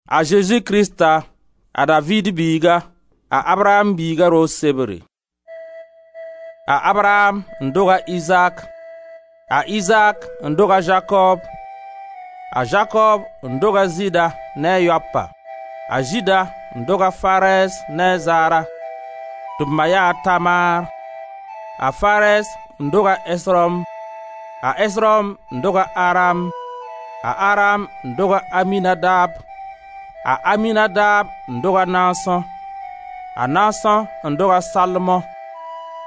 A Zezi Krista, a Daviid biiga, a Abraam biiga roog sebre. A Abraam n doga Izaak. A Izaak n doga Zakoob, a Zakoob n doga Zɩɩda ne a yaopa, a Zɩɩda n dog a Fares ne a Zara, tɩ b ma yaa Tamar, a Fares n dog a Esrom, a Esrom n dog a Aram, a Aram n doga Aminadab, a Aminadab n dog a Naason, a Naason n dog a Salmon,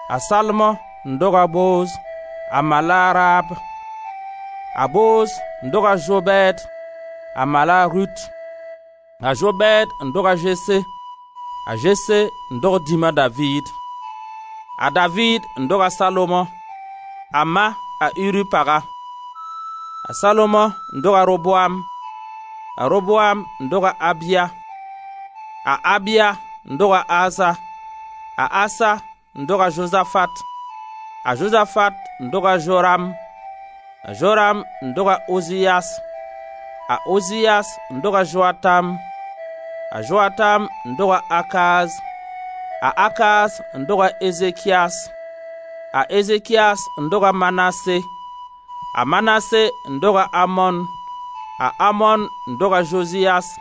a Salmon n dog a Booz, a ma la a Raab, a Booz n dog a Zobɛɛd, a ma la a Rut, a Zobɛɛd n dog a Zese, a Zese n dog dĩm a Daviid. A Daviid n dog a Salomo, a ma a Uri paga, a Salomo n dog a Roboam, a Roboam n dog a Abia, a Abia n dog a Asa, a Asa n dog a Zozafat, a Zozafat n dog a Zoram, a Zoram n dog a Oziyas, a Oziyas n dog a Zoatam, a Zoatam n dog a Akaz, a Akaz n dog a Ezekiyas, A Ezekiyas n dog a Manase, a Manase n dog a Amon, a Amon n dog a Zoziyas,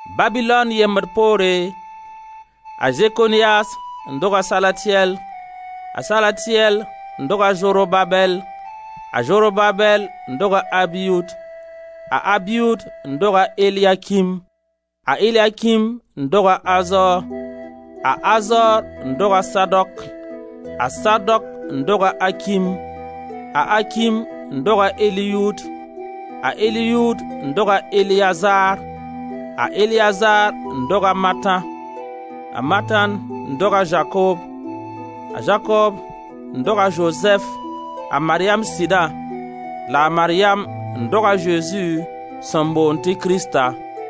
Babilon yembd poore, a Zekoniyas n dog a Salatiyɛl, a Salatiyɛl n dog a Zorobabɛl, a Zorobabel n dog a Abiud, a Abiud n dog a Eliakim, a Eliakim n dog a Azor, a Azor n dog a Sadok, a Sadok n dog a Akim, a Akim n dog a Eliyud, a Eliud n doga Eleazar, a Eleazar n dog a Matan, a Matan n dog a Zakoob, a Zakoob n dog a Zozɛf, a Maryam sɩda la a Maryam n dog a Zezi, sẽn boond tɩ Krista.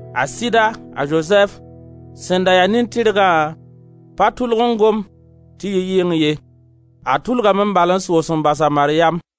A sɩda, a Zozɛf, sẽn da ya nin-tɩrgã, pa tʋlg n gom tɩ yi yɩng ye a tʋlgame bal n soos n bas a Maryam.